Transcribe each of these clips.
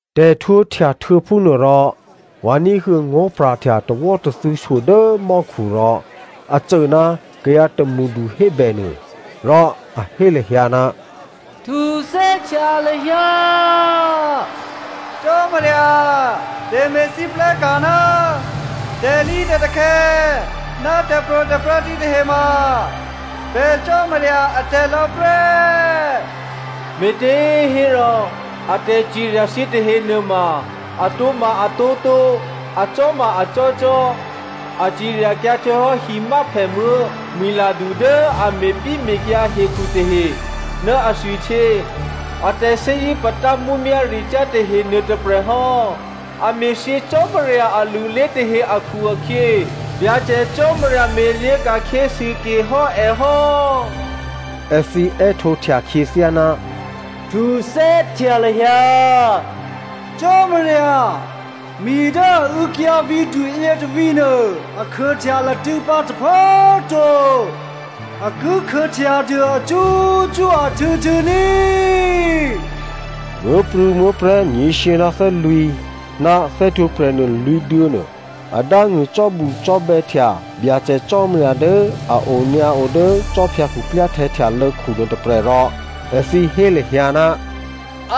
Tè̤htwǒhtya htuô̌ phúnuôrò vǎ ní̤huô̌ ngó̤pra̤htya tawò́tathû̌ shyo dố mò́khu rò a cô ná kayǎ tômṳdu hébè nuô, rò a hé lahyǎ, “Htuthè́htya lahyǎ Cò́marya! Tè̤me̤lwóhteka̤ ná tè̤lǐtè̤takhè̌ ná tè̤pro̤tè̤prya̤ thǐtahe ma pè̤ Cò́marya atè̤ lò̌ prè́. Me̤těhérò a tè̤cirya thǐ tahenuôma atǒma atǒtǒ. Acò́ma acò́cò́. A ciryakyǎ htuô̌hò́ himyáphèmuố̤ mwi̤ladu dố a me̤pyéme̤kyǎ hekhu tahe ná athwihtyě a tè̤thè́zṳ̂́ patá mǔmyá̤ricyá̤ tahe nuôtôprè̤ hò́. A me̤thyě Cò́marya alulé tahe akhu-akhyě Byacè Cò́marya me̤lyě̤ ka̤khyě sûke hò́ è hò́.” Èthǐ è́htǒhtya khyěthyá, “Htuthè́htya lahyǎ Cò́marya! Mi dố a û̌kyǎ vǐ̤du yětôvǐ̤ nuô a khuôhtya latṳ̂̌pǎ tôphuố꤮ to, a ki khuôhtya dû acṳ́cṳ́ ahtû̌htû̌ ní꤮.” Muố̤prû̌muố̤prè̤́ nyě̤shyě ná thè́lwǐ̤ ná thè́htwǒprè̤ nuô lwǐ̤duô̌ nuô, a dángṳ̂ cò́bucò́bè̌htya Byacè Cò́marya dố a onyǎo dố khwí khuklyáhtè̌ htyalô̌khu nuôtôprè̤ rò èthǐ hé lahyǎ,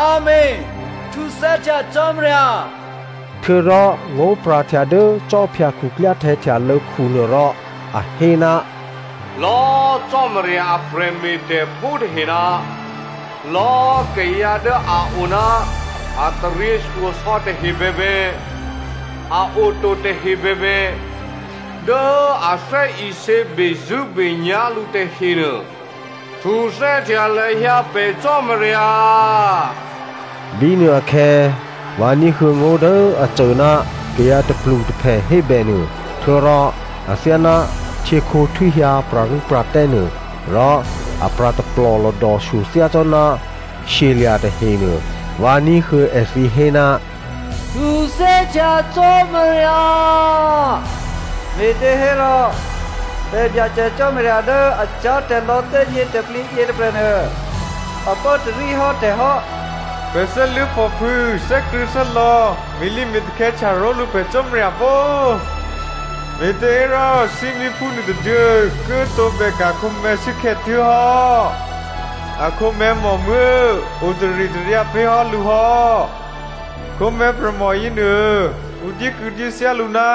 “Amèn! Htuthè́htya Cò́marya!” Htuô̌rò ngó̤pra̤htya dố khwí khuklyáhtè̌ htyalô̌khu nuôrò a hé, “Lò̌꤮ Cò́marya a prè̤me̤tè̤phú tahe ná lò̌ akayǎ dố a o ná a taryěshyosò̌ tahe bèbè, a oto tahe bèbè, dố a thè́isě bezṳ̂́benyá̤ lǔ tahenuô, htuthè́htya lahyǎ pè̤ Cò́marya.” Bínuôakhè̌ vǎ ní̤huô̌ ngó̤ dố a cô ná kayǎ tôplutôphè hébè nuô. Htuô̌rò athyáná htyěkhǒ htwíhyǎ pra̤rû́pra̤tè́ nuô, rò a pra̤ taplò̤lòdò shyo thyácò́ná shyelya̤ tahenuô. Vǎ ní̤huô̌ èthǐ hé, “Htuthè́htya Cò́marya, me̤těhérò pè̤ Byacè Cò́marya dố a cyá̤tè̤lò̌ thè́gnětè̤plǐ yětôprè̤nuô, a pốtarí hò́ tè̤ hò́. Pè̤ thè́luố̤phòphû̌ thè́krṳ̂̌thè́lò̌ me̤lǐme̤takhè̌htya ró̤lǔ pè̤ Cò́marya pó꤮. Me̤těhérò thímíphú nuôtôduô̌ ki tǒbè ka̤ khǒmè̤̌ shuốkhè̌ tuố̤hò́. Akhǒmè̤̌ mòmuố̤ o taritaryǎ pé̤ hò́ lǔ hò́. Khǒmè̤̌ prè̤mò yěnuô ǔ dyékû̌dyéthyá lǔ ná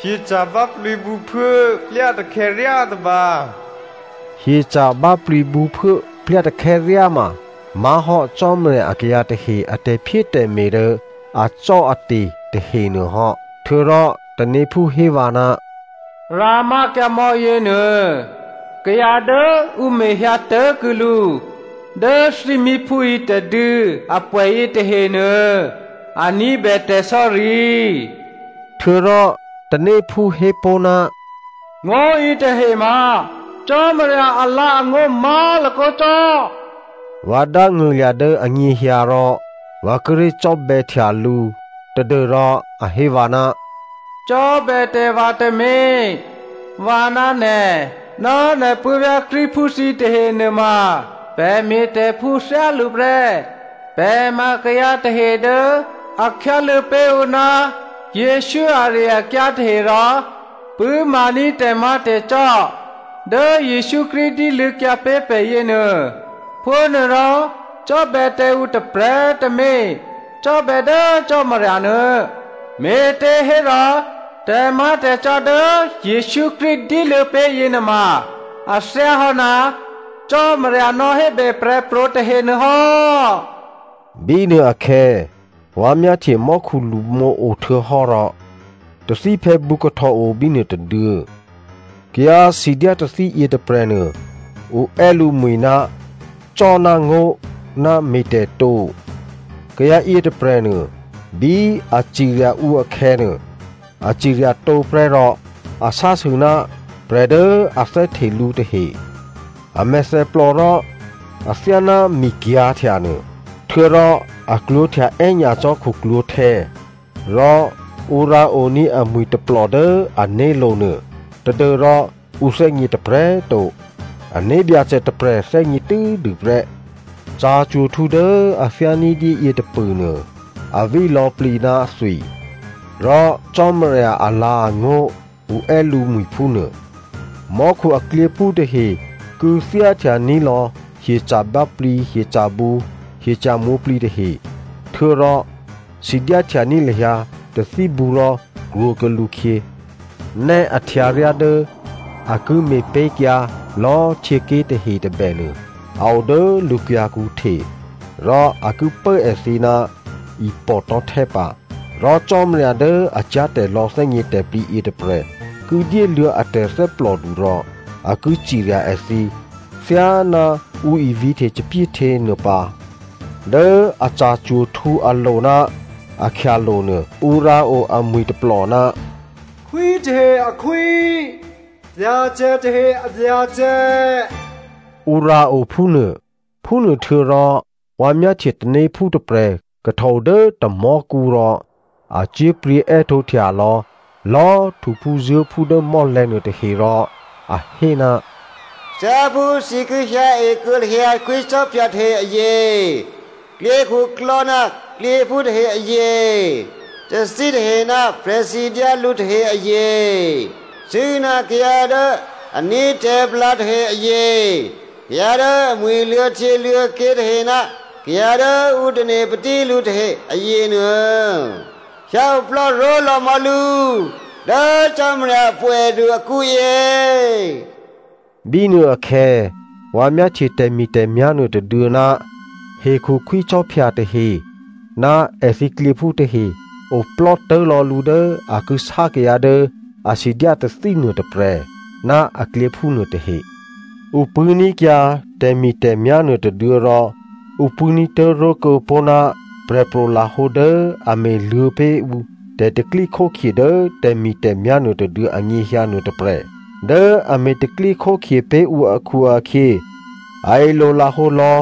hyeca̤ báplǐ bǔphuố plyatakhè̌ ryá tôba.” Hyeca̤ báplǐ bǔphuố plyatakhè̌ ryá ma má̤hò́ Cò́marya akayǎ tahe a tè̤phyétè̤me̤ dố acò́ate̤ tahenuô hò́. Htuô̌rò tanéphú hé vǎ, “Rǎmákyǎ mò̌ yěnuô. Kayǎ dố ǔ mehyǎ tố̤kuô̌ lǔ dố thímíphú yětôduô̌ apwè̌ yětahenuô, a ní̤bè tè̤sò̌ri.” Htuô̌rò tanéphú hé pó̤, “Ngó̤ yětahe ma Cò́marya alǎ̤angó̤ má̤lakǒ cò́.” Vǎ dángṳ̂lya̤ dố anyěhyǎ rò vǎ kíré̤ cò́bè̌htya lǔ tadû́rò a hé vǎ, “Cò́bè̌ tǎ vǎ tǎmé̤, vǎ ná nè̤ ná nè̤ puố̤vyá̤ Krístuphú thǐ tahe nuôma prè̤me̤tè̤phú thyálǔ prè́. Pè̤ ma kayǎ tahe dố a khyáluô̌ pé̤ ǔ ná Jesǔ ari-akyǎ tahe rò pṳ̂́maní̤ tè̤má̤tè̤cò́ dố Jesǔ Krístu dyéluô̌kyǎ pé̤ pè̤ yěnuô. Phúnuôrò, cò́bè̌ tǎ ǔ tôprè̤꤮ tǎmé̤, cò́bè̌ dố Cò́marya nuô. Me̤těhérò tè̤má̤tè̤cò́ dố Jesǔ Krístu dyéluô̌ pé̤ yěnuôma a thyáhò́ ná Cò́marya nò̌hébè prè̤pro̤ tahenuô hò́.” Bínuôakhè̌ vǎ myáhtye mò́khu lṳmǒo htuô̌hò́ rò tathíphè̌bǔ kahtòo bínuô tôduô̌. Kayǎ sidyá tathí yětôprè̤nuô ǔ è́ lǔmwi̤, “Cò́ ná ngó̤” ná “Me̤tè̤ tǒ.” Kayǎ yětôprè̤nuô, bí a cirya ǔ akhè̌nuô, a cirya tǒ prè́ rò a sásû ná prè̤ dố a thè́hte lǔ tahe. A mèthèplò rò athyáná mi kyǎ̤htya nuô, htuô̌rò a klwǒ̤htya è́nyacò́ khuklwǒ̤htè̌, rò ǔ rǎoní̤ amwi̤ tôplò dố ané̤lo̤ nuô tadû́rò ǔ thè́gně tôprè̤꤮ to, ané̤ Byacè tôprè̤ thè́gně tû́dû prè́. Ca̤cwo̤htǔ dố a thyá ní̤dyé yě tôpṳ̂nuô, a ví lò̌plǐ ná thwi. Rò “Cò́marya alǎ̤angó̤,” ǔ è́ lǔmwi̤ phúnuô. Mò́khu aklyěphú tahe kû̌thyá htyaní̤lò̌ hyeca̤ báplǐ, hyeca̤bǔ, hyeca̤ mwǒ̤plǐ tahe htuô̌rò sidyá htyaní̤ lahyǎ tathíbǔ rò krwǒkuô̌ lǔkhyě. Nè́ a htyǎryá dố a ki me̤pé̤kyǎ lò̌ htyěké̤ tahe tôbènuô a o dố lǔ kyǎ̤kǔ hte. Rò a ki pố èthǐ ná ipò̤ tò̤́htè́ pǎ. Rò Cò́marya dố a cyá̤tè̤lò̌ thè́gnětè̤plǐ yětôprè̤ ki dyéluô̌ a tè̤thè́plòdu rò a ki cirya èthǐ thyáná ǔ ivǐ̤hte thòbǐthèhtyě nuô pǎ. Dố a ca̤cwo̤htǔ alo̤ ná akhyalo̤ nuô, ǔ rǎo amwi̤ tôplò, “Khwítahe akhwí, Byacè tahe abyacè,” Ǔ rǎo phúnuô. Phúnuôhtuô̌rò vǎ myáhtye tanéphú tôprè̤ kahtòo dố tamò̤́kǔ rò a cyé̤pryě̤ è́htǒhtya lò̌lò̌꤮ htuphúzuố̤phú dố mò́lè̤̌ nuôtahe rò a hé, “Thyáphú thǐ ki hyǎe kuô̌ lahyǎ khwícò́phya tahe azye, klyěkhuklò́ ná klyěphú tahe azye, tathí tahe ná prè̤sidyá lǔ tahe azye, cṳ̂́ ná kayǎ dố a ní̤ tè̤palǎ tahe azye, kayǎ dố amwi̤ luô̌htyěluô̌ké̤ tahe ná kayǎ dố ǔ tane̤ patí lǔ tahe azyenuô, hyǎoplò́ ró̤lò̌mò̌ lǔ dố Cò́marya apwè̌du akǔyě.” Bínuôakhè̌ vǎ myáhtye tè̤mi̤tè̤myá̤ nuôtôduô̌ ná hekhu khwícò́phya tahe ná èthǐ klyěphú tahe oplò́tố̤ lò̌ lǔ dố a ki sá kayǎ dố a sidyá tathí nuôtôprè̤ ná aklyěphú nuôtahe. Ǔ pṳ̂́ní̤kyǎ tè̤mi̤tè̤myá̤ nuôtôduô̌ rò ǔ pṳ̂́ní̤ tố̤ró̤ kuô̌pó̤ ná prè̤pro̤ lahǒ dố a me̤luô̌ pé̤ ǔ tè̤pro̤tè̤prya̤ dố tè̤mi̤tè̤myá̤ nuôtôduô̌ anyěhyǎ nuôtôprè̤. Dố a me̤ tè̤pro̤tè̤prya̤ pé̤ ǔ akhu-akhyě, a ilolahǒ lò̌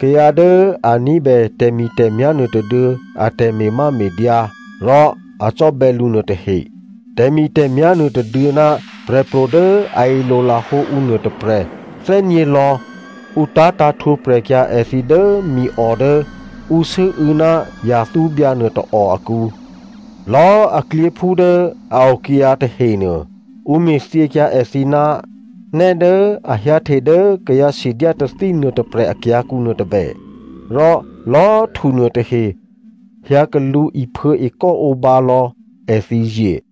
kayǎ dố a ní̤bè tè̤mi̤tè̤myá̤ nuôtôduô̌ a tè̤me̤máme̤dyǎ rò a cò́bè̌ lǔ nuôtahe. Tè̤mi̤tè̤myá̤ nuôtôduô̌ ná prè̤pro̤ dố a ilolahǒ ǔ nuôtôprè̤ thè́gně lò̌ ǔ tá̤tǎ̤ htwǒprè̤ kyǎ èthǐ dố miò dố ǔ sû́û̌ ná yathúbyǎ nuôtôò akǔ. Lò̌꤮ a klyěphú dố a okyǎ tahenuô, ǔ me̤thyěkyǎ èthǐ ná nè́ dố a hyǎhte dố kayǎ sidyá tathí nuôtôprè̤ akyǎ̤kǔ nuôtôbè, rò lò̌꤮ htu nuôtahe hyǎ lṳ̌ iphuô̌ ekò́ǒbǎ lò̌ èthǐ zye.